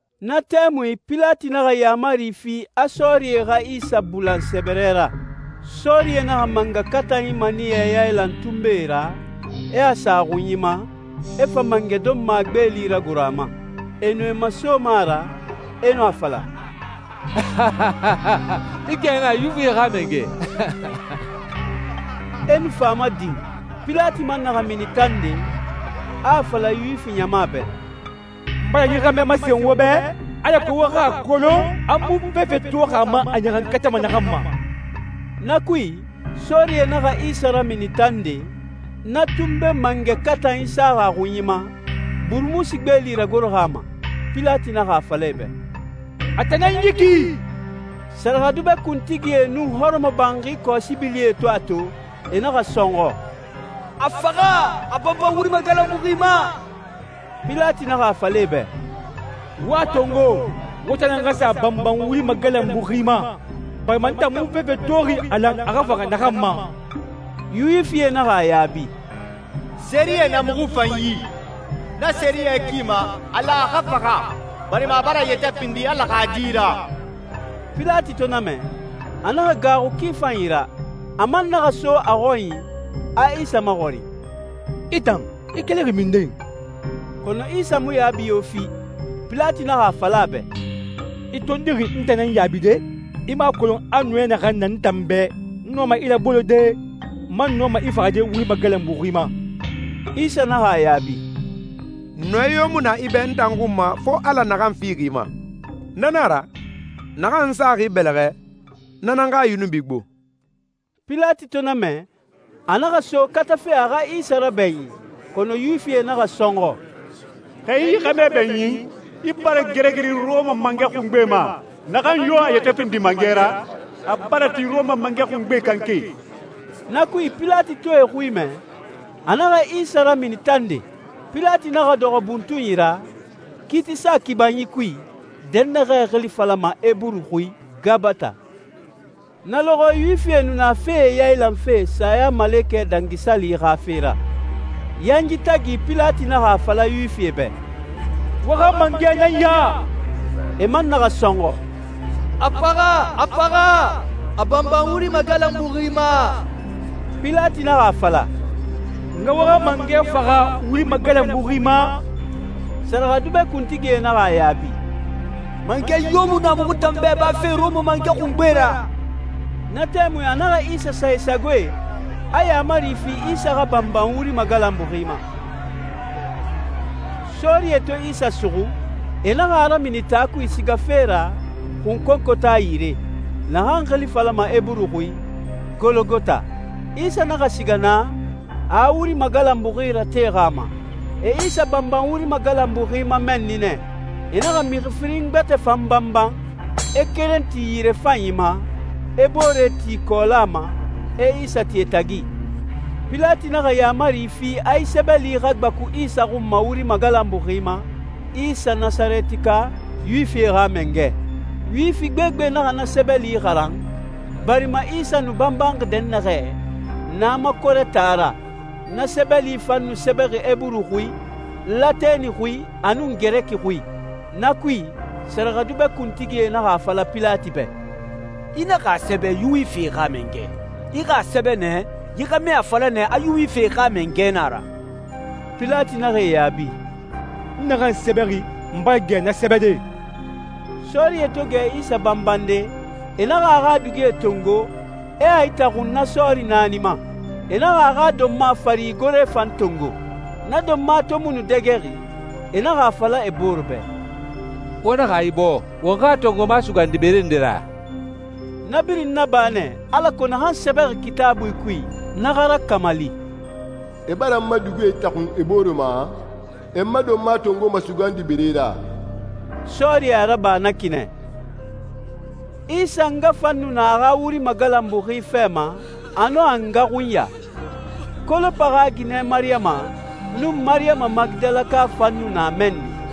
Na tɛmui Pilati naxa yaamari fi a sɔɔrie xa Isa bulan sɛbɛrɛ ra. Sɔɔrie naxa mangɛ katanyi maniyɛ yailan tunbee ra, e a sa a xun ma, e fa mangɛ donma gbeeli ragoro a ma. E nu e masoma a ra, e nu a fala, «I kɛna, Yuwifie xa mangɛ,» e nu fa a madin. Pilati man naxa mini tande, a a fala Yuwifi ɲama bɛ, «N bara yi xɛmɛ masen wo bɛ, alako wo xa a kolon a n mu fefe toxi a ma a ɲaxankatama naxan ma.» Na kui, sɔɔrie naxa Isa ramini tande, na tunbe mangɛ katanyi saxi a xun ma, burumusi gbeeli ragoroxi a ma. Pilati naxa a fala e bɛ, «A tan nan yi ki!» Sɛrɛxɛdubɛ kuntigie nun hɔrɔmɔbanxi kɔsibilie to a to, e naxa sɔnxɔ, «A faxa! A banban wuri magalanbuxi ma!» Pilati naxa a fala e bɛ, «Wo a tongo, wo tan nan xa sa a banban wuri magalanbuxi ma, barima n tan mu fefe toxi a lan a xa faxa naxan ma.» Yuwifie naxa a yaabi, «Sɛriyɛ na muxu fan yi. Na sɛriyɛ ki ma, a lan a xa faxa, barima a bara a yɛtɛ findi Ala xa Di ra.» Pilati to na mɛ, a naxa gaaxu ki fanyi ra. A man naxa so a xɔnyi, a Isa maxɔrin, «I tan, i kelixi minden?» Kɔnɔ Isa mu yaabi yo fi. Pilati naxa fa a fala a bɛ, «I tondixi n tan nan yaabide? I mu a kolon a nɔɛ naxan na n tan bɛ, n nɔma i rabolode, n man nɔma i faxade wuri magalanbuxi ma?» Isa naxa a yaabi, «Nɔɛ yo mu i bɛ n tan xun ma fo Ala naxan fixi i ma. Na nan a ra, naxan n saxi i bɛlɛxɛ, na nan xa yunubi gbo.» Pilati to na mɛ, a naxa so katafe a xa Isa rabɛɲin, kɔnɔ Yuwifie naxa sɔnxɔ, «Xa i yi xɛmɛ bɛɲin, i bara gere giri Rɔma mangɛ xungbe ma. Naxan yo a yɛtɛ findi mangɛ ra, a bara ti Rɔma mangɛ xungbe kanke.» Na kui, Pilati to e xui mɛ, a naxa Isa ramini tande. Pilati naxa dɔxɔ buntunyi ra, kiitisa kibanyi kui, dɛnnaxɛ xili falama Eburu xui «Gabata». Na lɔxɔɛ Yuwifie nu na fee yailanfe Sayamalekɛ Dangi Sali xa fe ra. Yanyi tagi Pilati naxa a fala Yuwifie bɛ, «Wo xa mangɛ nan ya!» E man naxa sɔnxɔ, «A faxa! A faxa! A banban wuri magalanbuxi ma!» Pilati naxa a fala, «N xa wo xa mangɛ faxa wuri magalanbuxi ma?» Sɛrɛxɛdubɛ kuntigie naxa a yaabi, «Mangɛ yo mu na muxu tan bɛ bafe Rɔma mangɛ xungbe ra!» Na tɛmui a naxa Isa sa e sagoe, a yaamari fi Isa xa banban wuri magalanbuxi ma. Sɔɔrie to Isa suxu, e naxa a ramini taa kui sigafe ra «xun konkota yire,» naxan xili falama Eburu xui «Gologota.» Isa naxa siga naa, a wuri magalanbuxi ratexi a ma. E Isa banban wuri magalanbuxi ma mɛnni nɛ. E naxa mixi firin gbɛtɛ fan banban, e keren ti yirefanyi ma, e boore ti kɔɔla ma, e Isa ti e tagi. Pilati naxa yaamari fi a yi sɛbɛli xa gbaku Isa xun ma wuri magalanbuxi ma, «Isa Nasarɛtika, Yuwifie xa mangɛ». Yuwifi gbegbe naxa na sɛbɛli xaran, barima Isa nu banbanxi dɛnnaxɛ, na makɔrɛ taa ra. Na sɛbɛli fan nu sɛbɛxi Eburu xui, Latɛni xui, a nun Girɛki xui. Na kui, sɛrɛxɛdubɛ kuntigie naxa a fala Pilati bɛ, «I naxa a sɛbɛ ‹Yuwifie xa mangɛ›. I xa a sɛbɛ nɛ, ‹Yi xɛmɛ a fala nɛ, a Yuwifie xa mangɛ nan a ra.›» Pilati naxa e yaabi, «N naxan sɛbɛxi, n bara gɛ na sɛbɛde.» Sɔɔrie to gɛ Isa banbande, e naxa a xa dugie tongo, e e itaxun na sɔɔri naani ma. E naxa a xa donma fari igoroe fan tongo. Na donma to mu nu dɛgɛxi, e naxa a fala e bore bɛ, «Won naxa a ibɔɔ. Won xa a tongoma sugandi bere nde ra.» Na birin naba nɛ, alako naxan sɛbɛxi Kitaabui kui, na xa rakamali: «E bara n ma dugie itaxun e bore ma, e n ma donma tongoma sugandi bere ra.» Sɔɔrie a raba na ki nɛ. Isa nga fan nu na a xa wuri magalanbuxi fɛ ma, a nun a nga xunya. Kolopa xa ginɛ Mariyama, nun Mariyama Magidalaka fan nu na mɛnni.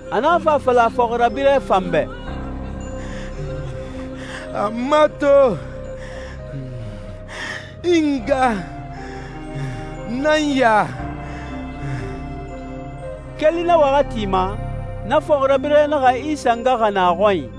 A naxa fa a fala a fɔxirabirɛ fan bɛ, «A mato, i nga nan ya.» Keli na waxati ma, na fɔxirabirɛ naxa Isa nga xanin a xɔnyi.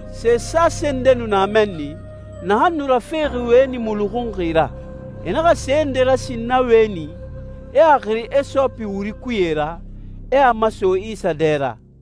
Se sase nde nu na mɛnni, naxan nu rafexi wɛni muluxunxi ra. E naxa se nde rasin na wɛni i, e a xiri hisopi wuri kuye ra, e a maso Isa dɛ ra.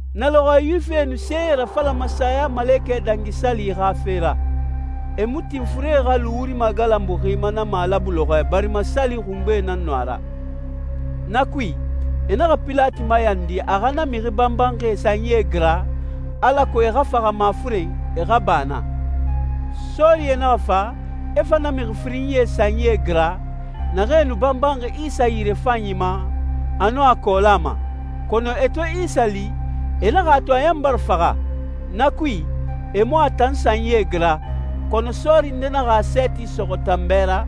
Na lɔxɔɛ Yuwifie nu see rafalama Sayamalekɛ Dangi Sali xa fe ra. E mu tin furee xa lu wuri magalanbuxi ma na malabu lɔxɔɛ, barima sali xungbe nan nu a ra. Na kui, e naxa Pilati mayandi a xa na mixi banbanxie sanyie gira, alako e xa faxa mafuren, e xa ba na. Sɔɔrie naxa fa, e fa na mixi firinyi sanyie gira, naxee nu banbanxi Isa yirefanyi ma, a nun a kɔɔla ma. Kɔnɔ e to Isa li, e naxa a to a ɲan bara faxa. Na kui, e mu a tan sanyie gira, kɔnɔ sɔɔri nde naxa a sɛɛti sɔxɔ tanbɛ ra,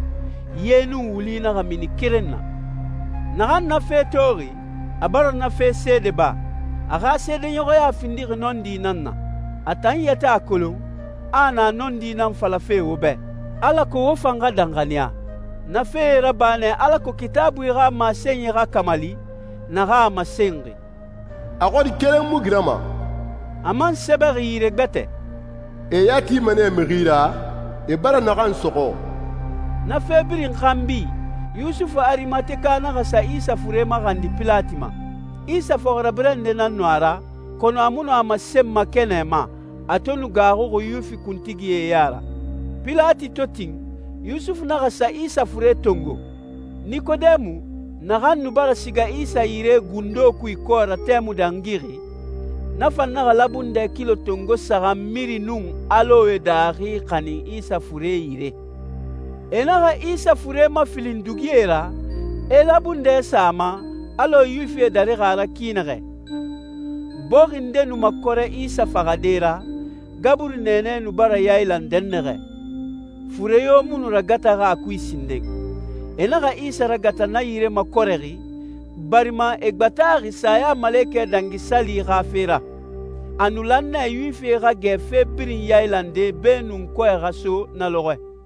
ye nun wuli naxa mini keren na. Naxan na fe toxi, a bara na fe seede ba. A xa seedeɲɔxɔya findixi nɔndi nan na. A tan yɛtɛ a kolon, a a na nɔndi nan falafe wo bɛ, alako wo fan xa danxaniya. Na fee raba nɛ alako Kitaabui xa masenyi xa kamali, naxan a masenxi, «A xɔri keren mu girama.» A man sɛbɛxi yire gbɛtɛ, «E e ya tima nɛ mixi ra, e bara naxan sɔxɔ.» Na fe birin xanbi, Yusufu Arimateka naxa sa Isa fure maxandi Pilati ma. Isa fɔxirabirɛ nde nan nu a ra, kɔnɔ a mu nu a masenma kɛnɛ ma, a to nu gaaxuxi Yuwifi kuntigie ya ra. Pilati to tin, Yusufu naxa sa Isa fure tongo. Nikodemu, naxan nu bara siga Isa yire gundo kui kɔɛ ra tɛmui dangixi, na fan naxa labundɛ kilo tongo saxan miri nun alowe daaxi xanin Isa fure yire. E naxa Isa fure mafilin dugie ra, e labundɛ sa a ma, alɔ Yuwifie darixi a ra ki naxɛ. Bɔxi nde nu makɔrɛ Isa faxade ra, gaburi nɛɛnɛ nu bara yailan dɛnnaxɛ. Fure yo mu nu ragataxi a kui sinden. E naxa Isa ragata na yire makɔrɛxi, barima e gbataxi Sayamalekɛ Dangi Sali xa fe ra. A nu lan nɛ Yuwifie xa gɛ fe birin yailande beenun kɔɛ xa so na lɔxɔɛ.